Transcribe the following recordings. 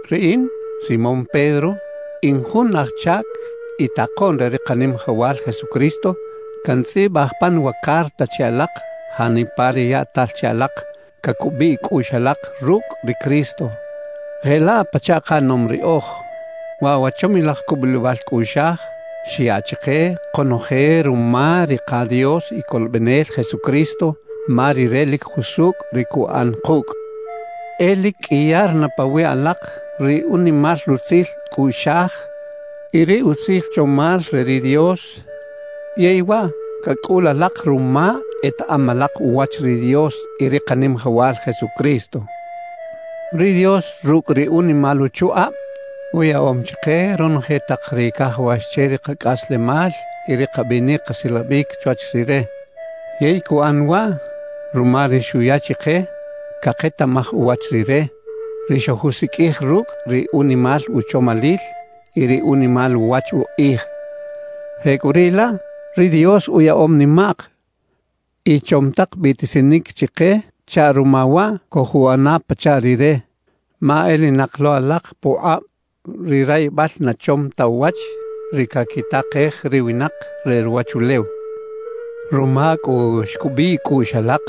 Riꞌin, Simón Pedro, in jun aj chac y takoꞌn re ri Kanimajawal Jesucristo. Cantzꞌibaj pan wa carta che alak, janipa ri yaꞌtal che alak cacubiꞌ cꞌuꞌx alak rucꞌ ri Cristo jelaꞌ pachaꞌ kaꞌanom riꞌoj. Waꞌ wa chomilaj cubulibal cꞌuꞌxaj xyaꞌ chike konoje ruma ri ka Dios y Colobenel Jesucristo, ma Rire lic jusucꞌ ri cuꞌan kucꞌ. E lic qꞌuiyar na pawiꞌ alak ri unimal rutzil cꞌuꞌxaj y ri utzil chomal re ri Dios, yey waꞌ cacꞌul alak ruma etaꞌam alak uwach ri Dios y ri Kanimajawal Jesucristo. Ri Dios rucꞌ ri unimal uchukꞌab, uyaꞌom chike ronoje tak ri cajawax che ri kacꞌaslemal y ri kabinic kasilabic chwach Rire. Yey cuꞌan waꞌ ruma ri xuya chike caketaꞌmaj uwach Rire, ri xojusiqꞌuij rucꞌ ri unimal uchomalil y ri unimal uwach ukꞌij. Jecꞌuriꞌlaꞌ, ri Dios uyaꞌom nimaꞌk y chom tak biꞌtisinic chike chaꞌ ruma waꞌ cojuꞌana pachaꞌ Rire, ma elinak lo alak pukꞌab ri rayibal na chom ta uwach, ri caquitakej ri winak re ruwachulew. Ruma cꞌu xcubiꞌ cꞌuꞌx alak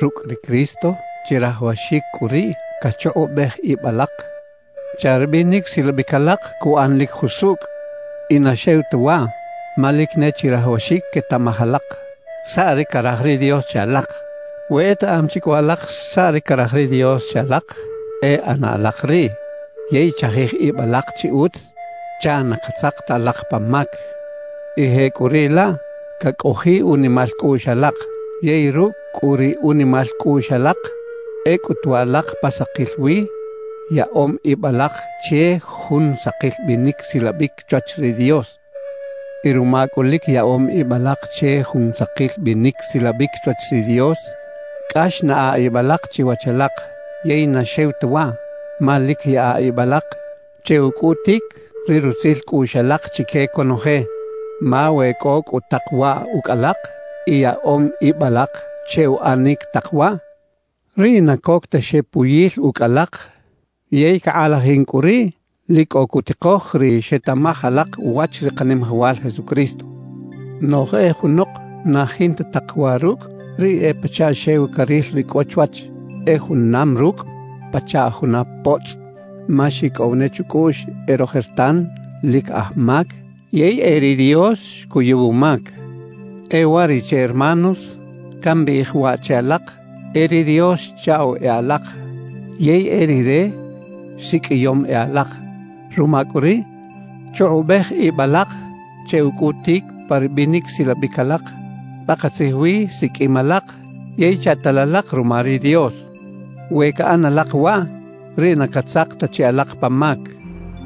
rucꞌ ri Cristo, chirajawaxic cꞌu riꞌ cachukꞌubej ib alak chaꞌ ri binic silabic alak cuꞌan lic jusucꞌ. Y na xew ta waꞌ, ma lic ne chirajawaxic quetaꞌmaj alak saꞌ ri caraj ri Dios che alak. We etaꞌam chi cꞌu alak saꞌ ri caraj ri Dios che alak, e ꞌana alak riꞌ. Yey chajij ib alak chi utz chaꞌ na catzak ta alak pa mac, y jecꞌuriꞌlaꞌ cacꞌojiꞌ unimal cꞌuꞌx alak. Yey rucꞌ cꞌu ri unimal cꞌuꞌx alak, e cꞌutu alak pa sakil wi yaꞌom ib alak che jun sakil binic silabic chwach ri Dios. Y ruma cꞌu lic yaꞌom ib alak che jun sakil binic silabic chwach ri Dios, cꞌax naꞌa ib alak chiwach alak. Yey na xew ta waꞌ, ma lic yaꞌa ib alak che ucꞌutic ri rutzil cꞌuꞌx alak chique conoje. Ma we cꞌo cꞌu tak waꞌ ucꞌ alak y yaꞌom ib alak che uꞌanic tak waꞌ, riꞌ na coc ta xepuyil ucꞌ alak yey cakꞌalajin cꞌu riꞌ lic cꞌo cutikoj ri xetaꞌmaj alak uwach ri Kanimajawal Jesucristo. Noꞌj e junok na jinta tak waꞌ rucꞌ, riꞌ e pachaꞌ xew caril ri cꞌo chwach; e junam rucꞌ pachaꞌ juna potzꞌ, ma xicꞌow ne chucꞌuꞌx e rojertan lic aj mac yey e ri Dios xcuyuw umac. E uwariꞌche hermanos, cambiꞌij waꞌ che alak: E ri Dios xchaꞌw e alak yey e Rire siqꞌuiyom e alak. Ruma cꞌu riꞌ, chukꞌubej ib alak che ucꞌutic pa ri binic silabic alak, pakatzij wi siqꞌuim alak yey chaꞌtal alak ruma ri Dios. We caꞌan alak waꞌ, riꞌ na catzak ta chi alak pa mac.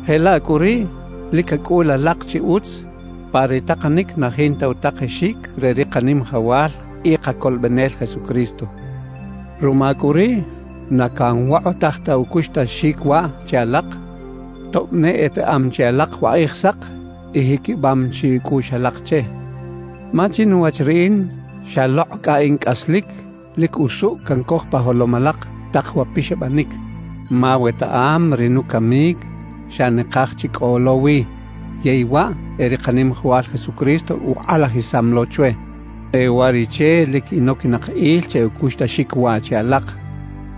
Jelaꞌ cꞌu riꞌ lic cacꞌul alak chi utz pa ri takanic na jinta utakexic re ri Kanimajawal y Kacolobenel Jesucristo. Ruma cꞌu riꞌ, na canwokꞌotaj ta ucuxtaxic waꞌ che alak, tob ne etaꞌam chi alak wa Kꞌijsak y jiquibam chi cꞌuꞌx alak che. Ma chinuwach riꞌin, xalokꞌ cꞌa in cꞌaslic, lic usucꞌ cancoj pa jolom alak tak wa pixabanic. Ma wetaꞌam ri nucamic xa nakaj chi cꞌo lo wi, yey waꞌ e ri Kanimajawal Jesucristo ukꞌalajisam lo chwe. E uwariꞌche lic inoquinak il che ucuxtaxic waꞌ che alak,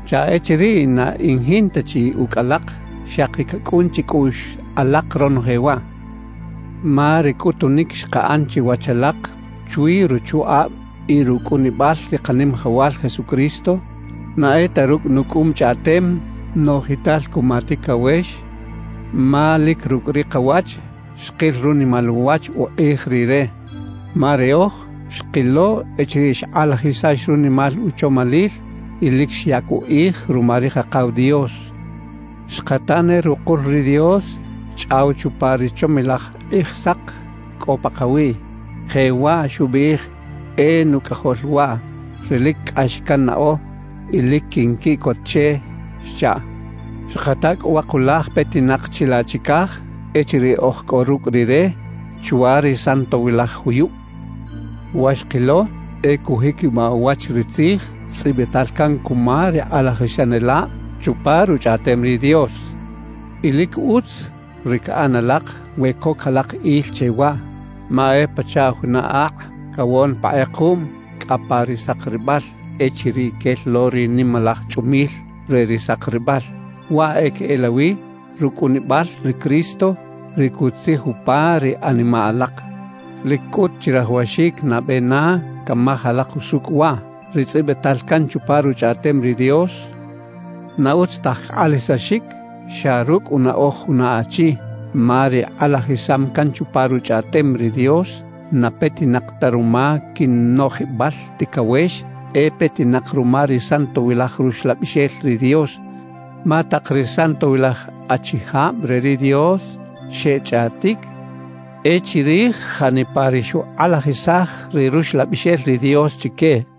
chaꞌ echiriꞌ na in jinta chi ucꞌ alak, xaki cacꞌun chicꞌuꞌx alak ronoje waꞌ. Ma ri cꞌutunic xkaꞌan chiwach alak chwi ruchukꞌab y rucꞌunibal ri Kanimajawal Jesucristo, na e ta rucꞌ nucꞌum chꞌaꞌtem noꞌjital cuma ticawex; ma lic rucꞌ ri kawach xkil runimal uwach ukꞌij Rire. Ma riꞌoj xkilo echiriꞌ xkꞌalajisax runimal uchomalil y lic xyac ukꞌij ruma ri Kakaw Dios. Xkata ne rukul ri Dios xchꞌaw chupa ri chomilaj kꞌijsak cꞌo pakawiꞌ, jewaꞌ xubiꞌij: «E Nucꞌajol waꞌ, ri lic cꞌax cannaꞌo y lic quinquiꞌcot che» xchaꞌ. Xkata cꞌu wa kulaj petinak chilaꞌ chicaj echiriꞌ oj cꞌo rucꞌ Rire chwa ri santowilaj juyub. Wa xkilo e cujiquibaꞌ uwach ri tzij tzꞌibital can cuma ri kꞌalajisanelab chupa Ruchꞌaꞌtem ri Dios. Y lic utz ri caꞌan alak we coc alak il che waꞌ, ma e pachaꞌ juna akꞌ cawon pa kꞌekuꞌm cꞌa pa ri sakribal echiriꞌ quel lo ri nimalaj chꞌumil re ri sakribal. Waꞌ e queꞌelawi rucꞌunibal ri Cristo, ri cutzij upa ri animaꞌ alak. Lic cꞌut chirajawaxic nabe na camaj alak usucꞌ waꞌ: Ri tzꞌibital can chupa Ruchꞌaꞌtem ri Dios, na utz taj cakꞌalajisaxic xa rucꞌ unaꞌoj juna achi. Ma ri kꞌalajisam can chupa Ruchꞌaꞌtem ri Dios, na petinak ta ruma quinoꞌjibal ticawex, e petinak ruma ri Santowilaj Ruxlabixel ri Dios. Ma tak ri santowilaj achijab re ri Dios xechꞌaꞌtic e chirij janipa ri xukꞌalajisaj ri Ruxlabixel ri Dios chique.